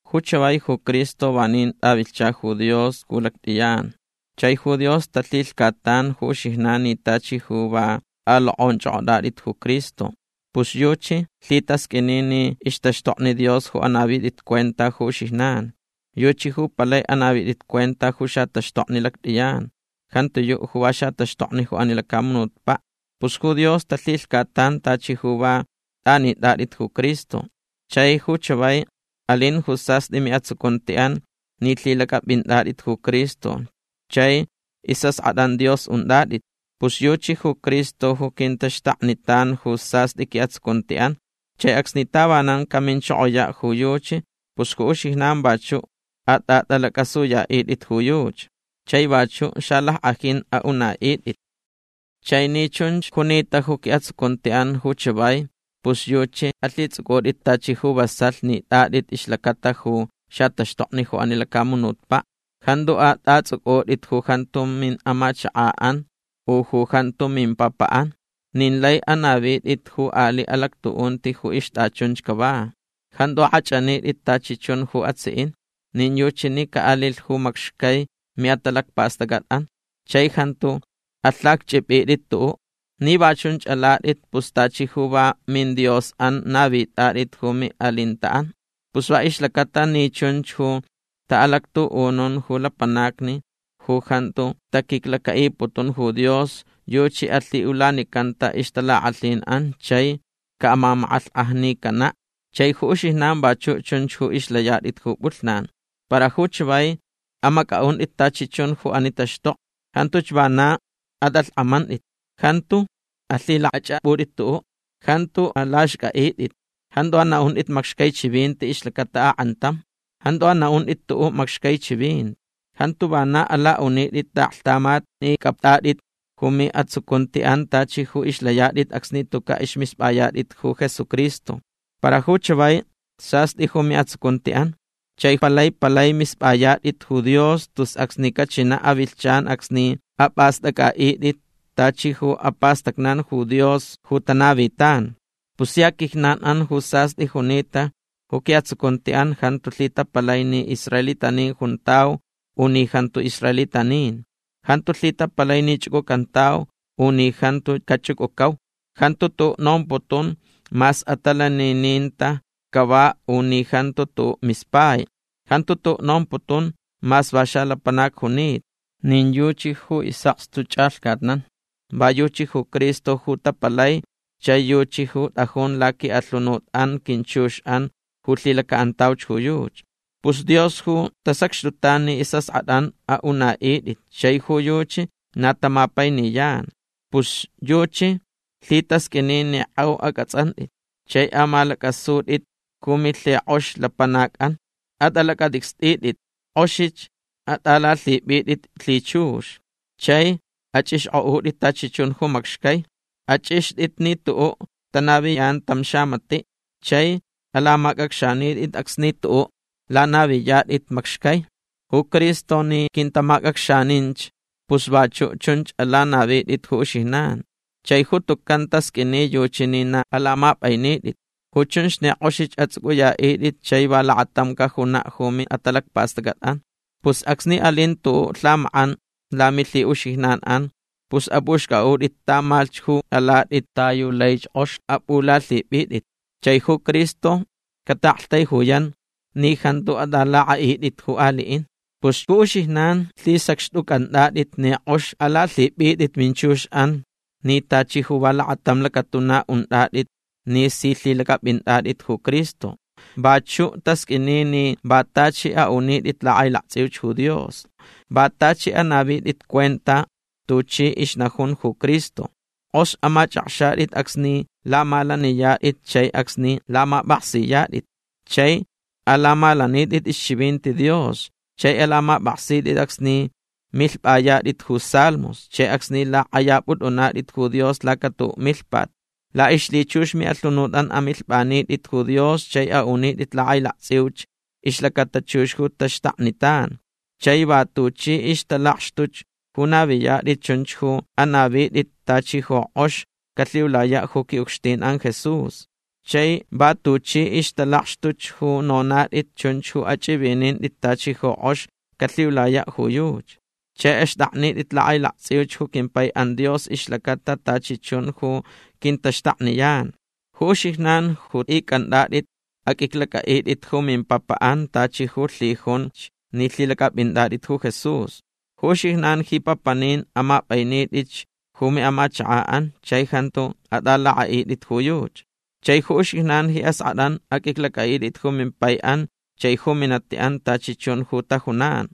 Ju chavai ju Cristo vanin tʼavilhcha ju Dios ju lactʼiyan. Chai ju Dios talhilhcatan ju uxijnan ni tachi ju va tʼalokʼonchʼokʼotʼatʼit ju Cristo. Pus yuchi lhitasqʼuini ni ixtaxtokni Dios ju anavitʼit cuenta ju uxijnan. Yuchi ju palai anavitʼit cuenta ju xataxtokni lactʼiyan. Jantiyuʼ ju va xataxtokni ju ani lacamunutpaʼ. Pus ju Dios talhilhcatan tachi ju va tʼanitʼatʼit ju Cristo. Chai ju chavai alin ju sastʼi miʼatsucuntiʼan ni lhilacʼapʼintʼatʼit ju Cristo chai isʼaskʼatʼan Dios untʼatʼit. Pus yuchi ju Cristo ju quintaxtaknitan ju sastʼi quiʼatsucuntiʼan. Chai acsni tavanan caminchokoyaʼ ju yuchi pus ju uxijnan vachuʼ atʼatʼalacʼasuyaʼitʼit ju yuchi. Chai vachuʼ xalackʼajin aʼunaʼitʼit. Chai ni chunch junita ju quiʼatsucuntiʼan ju chavai pus yuchi alhitsʼucʼutʼit tachi ju vasalh nitʼatʼit ixlacata ju xataxtokni ju ani lacamunutpaʼ. Jantu atʼatsʼucʼutʼit ju jantu miʼamachakaʼan u ju jantu mimpapaʼan. Nin lai anavitʼit ju aliʼ alactuʼunti ju ixtʼachunch cava. Jantu akʼachʼanitʼit tachi chun ju atsiʼin. Nin yuchi ni caʼalilh ju macxcai miʼatalacpastʼacʼatʼan. Chai jantu alhacchʼipʼitʼit tuʼuʼ. Ni va chunch alatʼit pus tachi ju va midiosʼan navitʼatʼit ju miʼalintaʼan. Pus va ixlacata ni chunch ju taʼalactuʼunun ju lapanacni ju jantu taquiclacaʼiputun ju Dios yuchi alhiʼulanicanta ixtalakʼalhinʼan chai caʼamamakʼalhkʼajnicanaʼ. Chai ju uxijnan vachuʼ chunch ju ixlayatʼit ju pʼulhnan. Para ju chavai amacʼaʼuntʼit tachi chun ju ani taxtokni. Jantuch vana atʼalhkʼamantʼit. Jantu alhilakʼachʼapʼutʼit tuʼuʼ. Jantu alaxcʼaʼitʼit. Jantu anaʼuntʼit macxcai chivinti ixlacata akʼantam. Jantu anaʼuntʼit tuʼuʼ macxcai chivinti. Jantu vana alaʼunitʼit taʼaklhtamat ni cʼaptʼatʼit ju miʼatsucuntiʼan tachi ju ixlayatʼit acsni tucaʼ ismispʼayatʼit ju Jesucristo. Para ju chavai sastʼi ju miʼatsucuntiʼan. Chai palai palai mispʼayatʼit ju Dios tus acsni cachinaʼ avilhchan acsni apʼastʼacʼaʼitʼit tachi ju apastacnan ju Dios ju tanavitan. Pus sia quijnanʼan ju sastʼi junita ju quiʼatsucuntiʼan jantu lhitapalai ni israelitanin juntau u ni jantu israelitanin. Jantu lhitapalai ni chʼucʼucantau u ni jantu cachʼucʼucau. Jantu tuʼuʼ nomputun mas atalanininta cava u ni jantu tuʼuʼ mispai. Jantu tuʼuʼ nomputun mas va xalapanac junita. Nin yuchi ju isʼakstu chʼalhcatnan. Va yuchi ju Cristo ju tapalai chai yuchi ju tʼajun laquiʼalhunutʼan quinchuxʼan ju lhilacaʼantauch ju yuchi. Pus Dios ju tasacxtutan ni isʼaskʼatʼan aʼunaʼitʼit chai ju yuchi na tamapainiyan. Pus yuchi lhitasqʼuini ni kʼeu acʼatsʼantʼit. Chai amalacʼasutʼit ju milhikʼox lapanacʼan. Atʼalacʼatʼicstʼitʼit. Kʼoxich atʼalalhipʼitʼit lhichux. Chai achʼixkʼotʼit tachi chun ju macxcai. Achʼixtʼit ni tuʼuʼ tanaviyan tam xamatiʼ. Chai alamacʼacxanitʼit acsni tuʼuʼ lanaviniyatʼit macxcai. Ju Cristo ni quintamacʼacxaninch pus vachuʼ chunch alanavitʼit ju uxijnan. Chai ju tucan tasqʼuini yuchi ni na alamapʼainitʼit. Ju chunch ni kʼoxich atsʼucʼuyaʼitʼit chai va lakatam cajunaʼ ju miʼatalacpastʼacʼatʼan. Pus acsni alin tuʼuʼ lhamakʼan lamilhiʼuxijnanʼan pus apʼuxcʼaʼutʼit tamalhch ju alatʼit ta yu laich kʼox apʼulalhipʼitʼit. Chai ju Cristo cataʼaktaijuyan ni jantu atʼalakʼaʼitʼit ju aliʼin. Pus ju uxijnan lhisacxtʼucʼantʼatʼit ni kʼox alalhipʼitʼit minchuxʼan ni tachi ju va lakatam lacatuna untʼatʼit ni si lhilacʼapʼintʼatʼit ju Cristo. Vachuʼ tasqʼuini ni va tachi aʼunitʼit lakʼailaktsʼiuch ju Dios. Va tachi anavitʼit cuenta tuchi ixnajun ju Cristo. Kʼox amachʼakxatʼit acsni lamalaniyatʼit chai acsni lamapʼaksiyatʼit. Chai alamalanitʼit ixchivinti Dios chai alamapʼaksitʼit acsni milhpʼayatʼit ju salmos chai acsni lakʼayapʼutʼunatʼit ju Dios laca tuʼuʼ milhpat. Laʼixlhichux miʼalhunutʼan amilhpʼanitʼit ju Dios chai aʼunitʼit lakʼailaktsʼiuch ixlacata chux ju taxtaknitan. Chai va tuchi ixtalakxtuch ju naviyatʼit chunch ju anavitʼit tachi ju kʼox calhiulayaʼ ju quiʼucxtinʼan Jesús. Chai va tuchi ixtalakxtuch ju nonatʼit chunch ju achʼivinintʼit tachi ju kʼox calhiulayaʼ ju yuchi. Chai axtʼaknitʼit lakʼailaktsʼiuch ju quimpaiʼan Dios ixlacata tachi chun ju quintaxtakniyan. Ju uxijnan ju icʼantʼatʼit aqʼuiclacʼaʼitʼit ju mimpapaʼan tachi ju lhijunch ni lhilacʼapʼintʼatʼit ju Jesús. Ju uxijnan ji papanin amapʼainitʼitch ju miʼamachakaʼan chai jantu atʼalakʼaʼitʼit ju yuchi. Chai ju uxijnan ji askʼatʼan aqʼuiclacʼaʼitʼit ju mimpaiʼan chai ju minatiʼan tachi chun ju tajunan.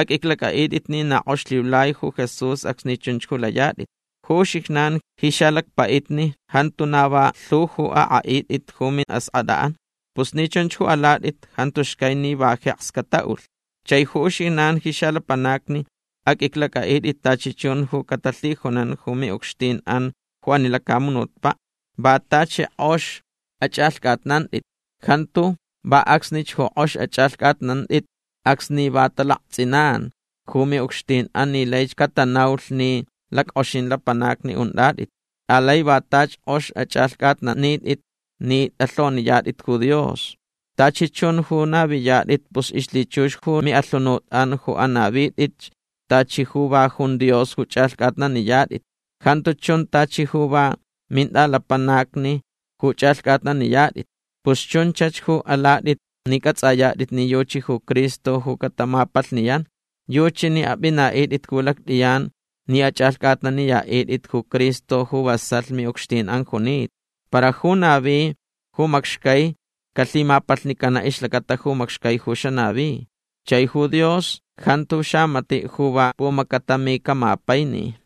Aqʼuiclacʼaʼitʼit ni na kʼox lhiulai ju Jesús acsni chunch ju layatʼit. Ju uxijnan ji xalacpaʼitni jantu na va lhu ju akʼaʼitʼit ju miʼaskʼatʼan. Pus ni chunch ju alatʼit jantu xcai ni va jeks cataʼulh. Chai ju uxijnan ji xalapanacni aqʼuiclacʼaʼitʼit tachi chun ju catalhijunan ju miʼucxtinʼan ju ani lacamunutpaʼ. Va tachi kʼox achʼalhcʼatnantʼit. Jantu va acsnich ju kʼox achʼalhcʼatnantʼit acsni va talaktsʼinan ju miʼucxtinʼan ni laich catanaulh ni lackʼoxin lapanacni untʼatʼit. Alai va tachi kʼox achʼalhcʼatnanitʼit ni tʼalhoniyatʼit ju Dios. Tachi chun ju naviyatʼit pus ixlhichux ju miʼalhunutʼan ju anavitʼitch tachi ju va jun Dios ju chʼalhcʼatnaniyatʼit. Jantu chun tachi ju va mintʼalapanacni ju chʼalhcʼatnaniyatʼit. Pus chunchach ju alatʼit ni cʼatsʼayatʼit ni yuchi ju Cristo ju catamapalhniyan. Yuchi ni apʼinaʼitʼit ju lactʼiyan ni achʼalhcʼatnaniyaʼitʼit ju Cristo ju vasalh miʼucxtinʼan junita. Para ju navi ju macxcai calhimapalhnicanaʼ ixlacata ju macxcai ju xanavi. Chai ju Dios jantu xamatiʼ ju va pumacatami camapaini.